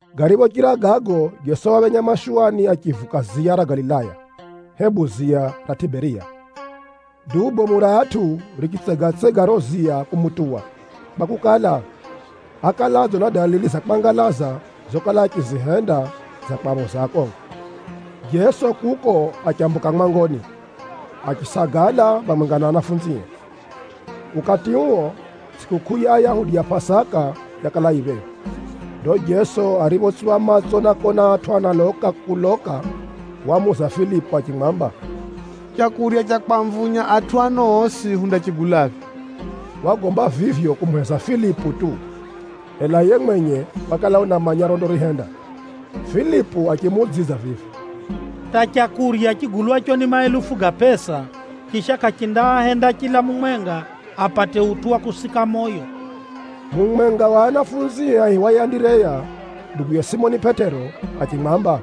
Gariphochira gago, Jeso waphenya mashuwani achivuka ziya ra Galilaya, (hebu ziya ra Tʼiberiya). Duu bomu ra atʼu richitsegatsega riro ziya kumutuwa kwakukala, ákala adzona dalili za kwangalaza zokala achizihenda za kwaphoza akongo. Jeso kuko achambuka mwangoni, achisagala phamwenga na anafunzie. Ukati uo, tsʼikukʼuu ya Ayahudi ya Pʼasaka yakala yifika phephi. Ndo Jeso ariphotsupha matso na kona atʼu analoka kuloka, wamuuza Filipu achimwamba, “Leu ra kwamvunya atʼu ano osi, hundarigulaphi?” (Wagomba vivyo kumuheza Filipu tu, ela yiye mwenye wakala unamanya rondarihenda.) Filipu achimuudzidza vivi, “Hata leu rigulwaro ni mahelufu ga pʼesa, chisha kʼarindaahenda chila mumwenga apate utʼu wa kusika moyo.” Mumwenga wa anafunzie aihiwaye Andireya, nduguye Simoni Pʼetero, achimwamba,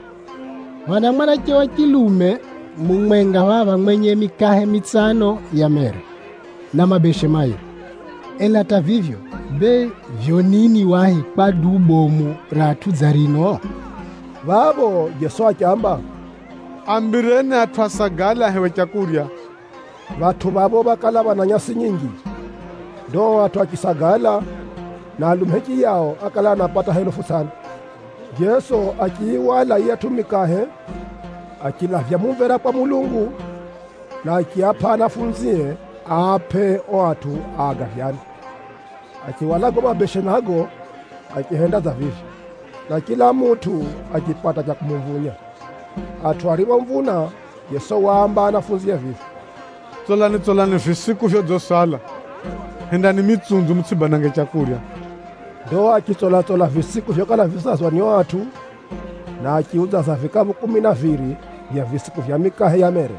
“Phana mwanache wa chilume mumwenga phapha mwenye mikahe mitsano ya mere, na mabeshe mairi. Ela hata vivyo, bee vivyo nini wahi kwa duu bomu ra atʼu dza rino?” Phapho Jeso achiamba, “Aambireni atʼu asagale ahewe leu.” Phatʼu phapho phákala phana nyasi nyinji. Ndo ao atʼu achisagala, na alume hichiyao ákala anapata helufu tsʼano. Jeso achiyihwala yiyatʼu mikahe, achilavya mumvera kwa Mulungu, na achiapʼa anafunzie aapʼe ao atʼu agavyane. Achihwala gago mabeshe nago, achihenda dza vivyo, na chila mutʼu achipata cha kumumvunya. Atʼu ariphomvuna, Jeso waamba anafunzie vivi, “Tsolani-tsolani visiku vyodzisala. Hendani mitsunzu mutsʼibanange leu.” Ndo achitsola-tsola visiku vyokala visazwa ni ao atʼu, na achiudzaza vikaphu kumi na viri vya visiku vya mikahe ya mere.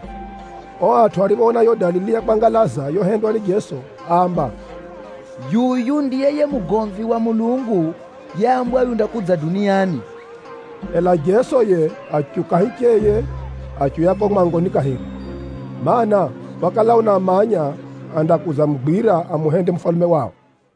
Ao atʼu ariphoona yiyo dalili ya kwangalaza yohendwa ni Jeso, áamba, “Yuyu ndiye yiye mugomvi wa Mulungu yeambwa undakudza duniani!” Ela Jeso yiye achiuka hicheye achiuya kuko mwangoni kahiri, mana, wakala unamanya andakudzamugwira amuhende mufalume wao.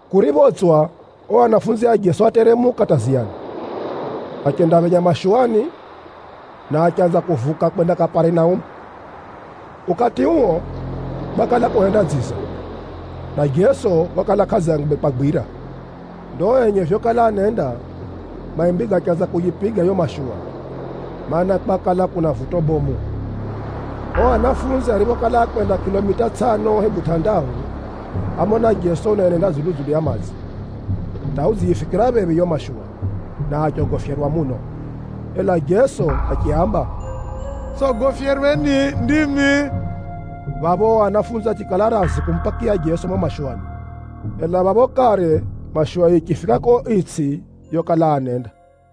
Kuriphotswa, ao anafunzi a Jeso áteremuka hata ziyani, achendaphenya mashuwani, na achanza kuvuka kwenda Kaparinaumu. Ukati uo, kwakala kuhenda dziza, na Jeso wakala kʼadzangwe kwagwira. Ndo enye vyokala anenda, maimbi gachanza kuyipiga yiyo mashuwa, mana, kwakala kuna vuto bomu. Ao anafunzi ariphokala ákwenda kʼilomita tsʼano hebu tʼandahu, ámona Jeso unaenenda dzulu-dzulu ya madzi, hata udziyifikira phephi yiyo mashuwa, na achogofyerwa muno. Ela Jeso achiaamba, “Tsʼogofyerweni, ndimi!” Phapho ao anafunzi achikala razi kumupakiya Jeso mumo mashuwani, ela phapho kare mashuwa yichifika kuko itsʼi yokala anenda.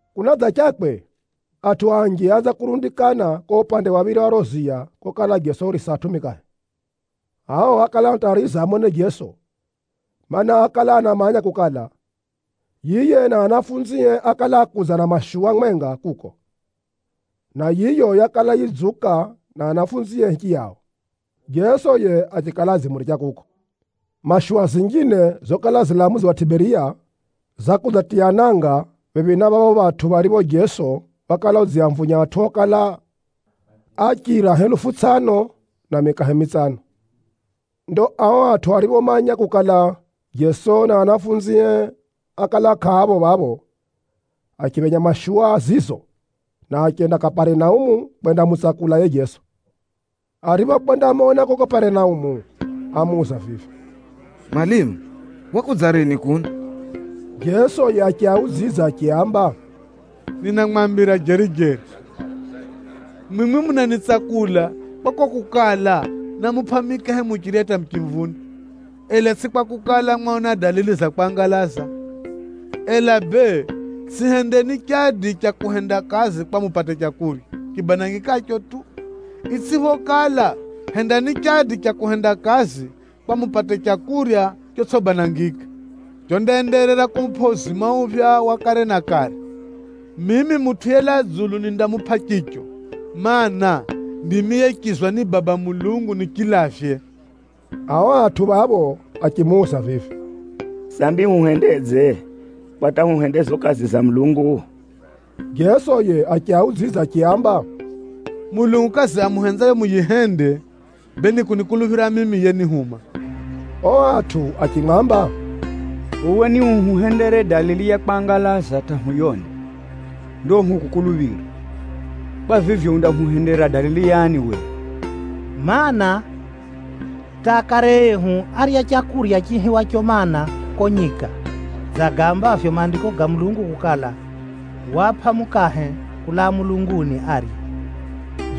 Kunadzachakwe, atʼu anji áanza kurundikana kuko upande wa phiri wa riro ziya kokala Jeso urisa atʼu mikahe. Ao ákala anatariza amone Jeso, mana, ákala anamanya kukala, yiye na anafunzie ákala ákudza na mashuwa mwenga kuko, na yiyo yakala yidziuka na anafunzie hichiyao, Jeso yiye achikala adzimuricha kuko. Mashuwa zinjine zokala zilaa mudzi wa Tʼiberiya, zakudzatiya nanga phephi na phapho phatʼu pharipho Jeso wakala udziamvunya atʼu okala achira helufu tsʼano na mikahe mitsano. Ndo ao atʼu ariphomanya kukala, Jeso na anafunzie ákala kʼaapho phapho, achiphenya mashuwa zizo, na achenda Kaparinaumu kwendamutsakula yiye Jeso. Ariphokwendamona kuko Kaparinaumu, ámuuza vivi, “Mwalimu, wakudza rini kuno?” Jeso yiye achiaudzidza achiaamba, “Ninamwambira jeri-jeri, mwimwi munanitsakula kwa kuko kukala námupʼa mikahe muchirya hata muchimvuna, ela tsʼi kwakukala, mwaona dalili za kwangalaza. Ela bee tsʼihendeni chadi cha kuhenda kazi kwa mupate leu ribanangikaro tu. Itsʼiphokala, hendani chadi cha kuhenda kazi kwa mupate leu rotsʼibanangika, rondaenderera kumupʼa uzima uphya wa kare na kare. Mimi Mutʼu yelaa dzulu nindamupʼa riro, mana, ndimi yechizwa ni Baba Mulungu nirilavye.” Ao atʼu phapho achimuuza vivi, “Sambi huhendedze kwa hata huhende zizo kazi za Mulungu?” Jeso yiye achiaudzidza achiaamba, “Mulungu kazi amuhenzayo muyihende, bee ni kunikuluphira mimi yenihuma.” Ao atʼu achimwamba, “Uwe niuhuhendere dalili ya kwangalaza hata huyone, ndo hukukuluphire. Kwa vivyo, undahuhendera dalili yani uwe? Maana, hata akare ehu árya leu riihiwaro mana, kuko nyika, dza gaambavyo Maandiko ga Mulungu kukala, ‘Waapʼa mukahe kulaa mulunguni arye.’”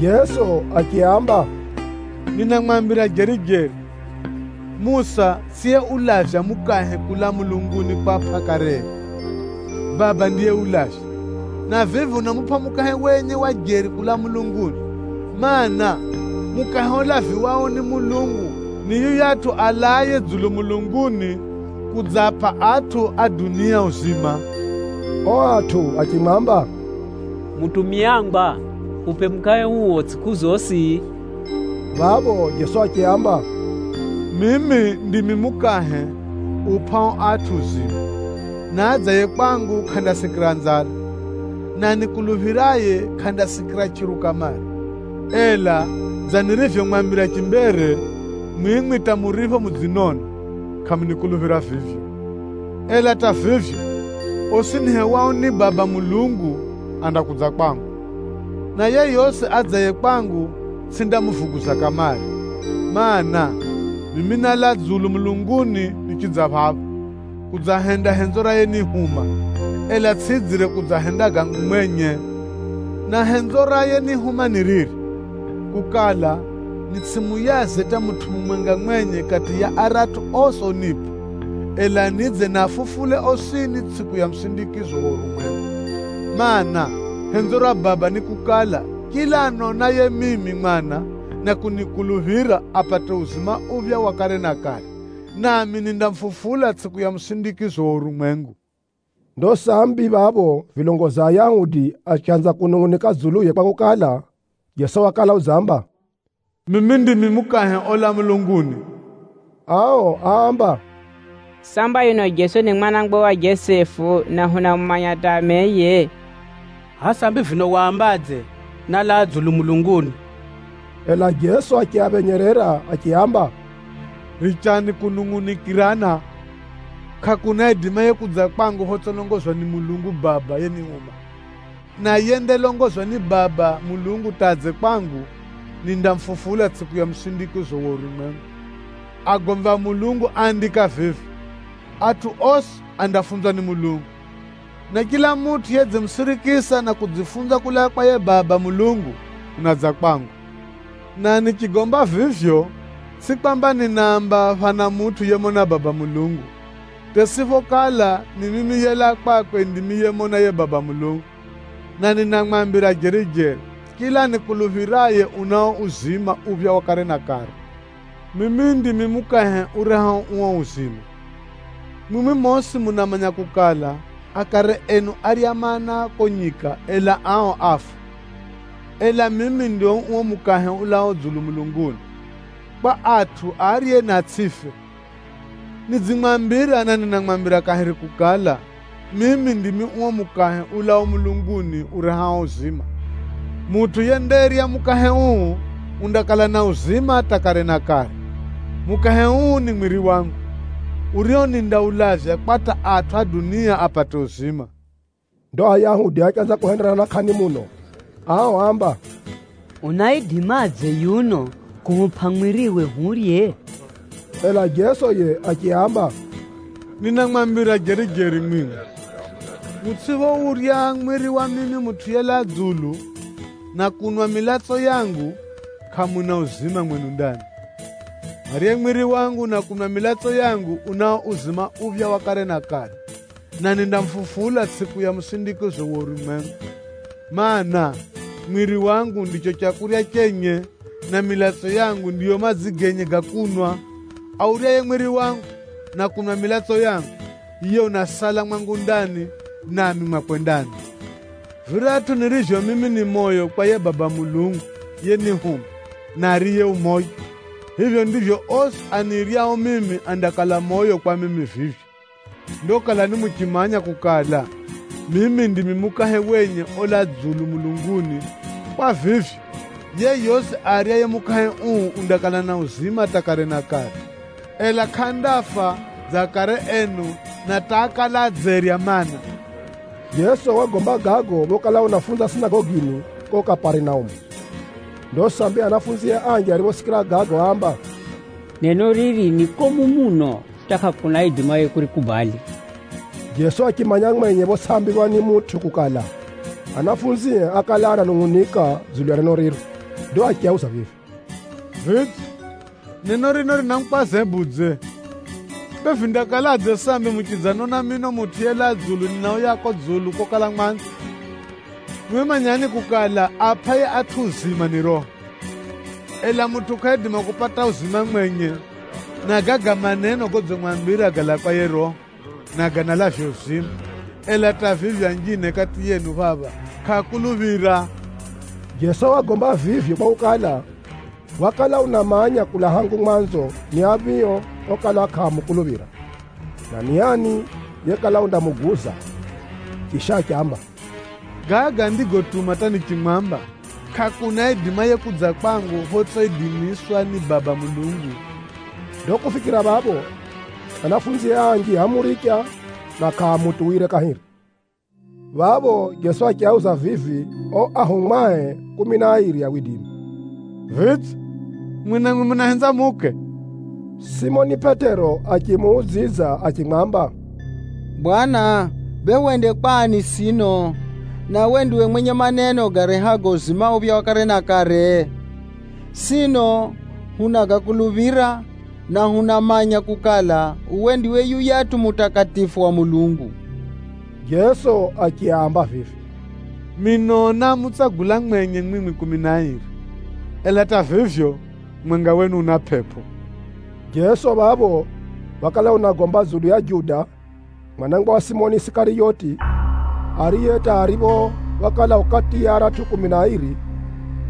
Jeso achiaamba, “Ninamwambira jeri-jeri, Musa tsʼiyeulavya mukahe kulaa mulunguni kwapʼa akare enu. Baba ndiyeulavya, na vivi unamupʼa mukahe wenye wa jeri kulaa mulunguni. Maana, mukahe ulaviwao ni Mulungu, ni yuyatʼu alaaye dzulu mulunguni kudzaapʼa atʼu a dunia uzima.” Ao atʼu achimwamba, “Mutumiangwa, hupʼe mukahe uo tsʼiku zosi.” Phapho Jeso achiaamba, “Mimi ndimi mukahe upʼao atʼu uzima, na adzaye kwangu kʼandasikira nzala, na anikuluphiraye kʼandasikira chʼiru kamare. Ela dza nirivyomwambira chimbere, mwimwi hata muripho mudzinona, kʼamunikuluphira vivyo. Ela hata vivyo, osi nihewao ni Baba Mulungu andakudza kwangu, na yeyosi adzaye kwangu tsʼindamuvuguza kamare. Maana, mimi nálaa dzulu mulunguni nichidza phapha, kudzahenda henzo ra yenihuma, ela tsʼidzire kudzahenda gangu mwenye. Na henzo ra yenihuma ni riri; kukala, nitsʼimuyaze hata mutʼu mumwenga mwenye kati ya aratʼu osi onipʼa, ela nidze niafufule osini tsʼiku ya musindikizo wa urumwengu. Maana, henzo ra Baba ni kukala, chila anonaye mimi Mwana na kunikuluphira, apate uzima uphya wa kare na kare, nami nindamufufula tsʼiku ya musindikizo wa urumwengu.” Ndo sambi phapho vilongozi a Ayahudi achanza kunungʼunika dzuluye kwakukala, Jeso wakala udzamba, “Mimi ndimi mukahe olaa mulunguni.” Ao áamba, “Samba yuno Jeso ni mwana wa Jesefu, na hunamumanya hata ameye! Hʼaya sambi vino wambadze, ‘Nálaa dzulu mulunguni’?” Ela Jeso achiaphenyerera achiaamba, “Richani kunungʼunikirana. Kʼakuna aidimaye kudza kwangu photsʼilongozwa ni Mulungu Baba yenihuma. Na yendalongozwa ni Baba Mulungu hata adze kwangu, nindamufufula tsʼiku ya musindikizo wa urumwengu. Agomvi a Mulungu áandika vivi, ‘Atʼu osi andafunzwa ni Mulungu.’ Na chila mutʼu yedzimusirikisa na kudzifunza kulaa kwa yiye Baba Mulungu, unadza kwangu. Na nichigomba vivyo tsʼi kwamba ninaamba phana mutʼu yemona Baba Mulungu, hata itsʼiphokala ni mimi yelaa kwakwe ndimi yemona yiye Baba Mulungu. Na ninamwambira jeri-jeri, chila anikuluphiraye unao uzima uphya wa kare na kare. Mimi ndimi mukahe urehao uo uzima. Mwimwi mosi munamanya kukala, akare enu árya mana kuko nyika, ela ao áfa. Ela mimi ndimi uo mukahe ulaao dzulu mulunguni, kwa atʼu arye na atsʼife. Nidzimwambira, na ninamwambira kahiri kukala, mimi ndimi uo mukahe ulaao mulunguni urehao uzima. Mutʼu yendarya mukahe uu, undakala na uzima hata kare na kare. Mukahe uu ni mwiri wangu, urio nindaulavya kwa hata atʼu a dunia apate uzima.” Ndo Ayahudi achanza kuhenderana kʼani muno. Ao áamba, “Unaidimadze yuno kuhupʼa mwiriwe hurye?” Ela Jeso yiye achiaamba, “Ninamwambira jeri-jeri mwimwi, mutsʼiphourya mwiri wa mimi Mutʼu yelaa dzulu, na kunwa milatso yangu, kʼamuna uzima mwenu ndani. Aryaye mwiri wangu na kunwa milatso yangu, unao uzima uphya wa kare na kare, na nindamufufula tsʼiku ya musindikizo wa urumwengu. Maana, mwiri wangu ndiro leu renye, na milatso yangu ndiyo madzi genye ga kunwa. Auryaye mwiri wangu, na kunwa milatso yangu, yiye unasala mwangu ndani, nami mwakwe ndani. Viratʼu nirivyo mimi ni moyo kwa yiye Baba Mulungu yenihuma na ariye u moyo, vivyo ndivyo osi aniryao mimi andakala moyo kwa mimi nirivyo. Ndo kalani muchimanya kukala, mimi ndimi mukahe wenye olaa dzulu mulunguni. Kwa vivyo, yeyosi aryaye mukahe uu undakala na uzima hata kare na kare, ela kʼandafa dza akare enu na hata ákala adzerya mana.” Jeso wagomba gago phokala unafunza sinagogini kuko Kaparinaumu. Ndo sambi anafunzie anji ariphosikira gago, áamba, “Neno riri ni komu muno hata kʼakuna aidimaye kurikubali!” Jeso achimanya mwenye photsʼiambirwa ni mutʼu kukala, anafunzie ákala ananungʼunika dzulu ya neno riro. Ndo achiauza vivi, “Vidze, neno rino rinamukwaza hebudze? Bee, vindakaladze sambi muchidzanona mino Mutʼu yelaa dzulu ninauya kuko dzulu kokala mwanzo? Mwimwi manyani kukala, aapʼaye atʼu uzima ni Roho, ela mutʼu kʼaidima kupata uzima mwenye. Na gaga maneno godzimwambira galaa kwa yiye Roho, na ganalavya uzima. Ela hata vivyo, anjine kati yenu phapha kʼaakuluphira.” (Jeso wagomba vivyo kwakukala, wakala unamanya kulaa hangu mwanzo ni aphio okala kʼaamukuluphira, na ni ani yekala undamuguza.) Chisha achiamba, “Gaga ndigotuma hata nichimwamba, kʼakuna aidimaye kudza kwangu photsʼiidimiswa ni Baba Mulungu.” Ndo kufikira phapho, anafunzie anji ámuricha, na kʼaamutuwire kahiri. Phapho Jeso achiauza vivi ao anafunzie kumi na airi, “Vidze, mwimwi namwi munahenza muuke?” Simoni Pʼetero achimuudzidza achimwamba, “Bwana, bee hwende kwa ani sino, na uwe ndiwe mwenye maneno garehago uzima uphya wa kare na kare? Sino hunagakuluphira, na hunamanya kukala, uwe ndiwe yuyatʼu Mutakatifu wa Mulungu.” Jeso achiaamba vivi, “Mino námutsagula mwenye mwimwi kumi na airi. Ela hata vivyo, mumwenga wenu una pʼepʼo!” (Jeso phapho wakala unagomba dzulu ya Juda, mwana wa Simoni Isikariyoti, ariye hata aripho wakala u kati ya aratʼu kumi na airi,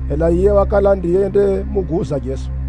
ela yiye wakala ndiye yendamuguza Jeso.)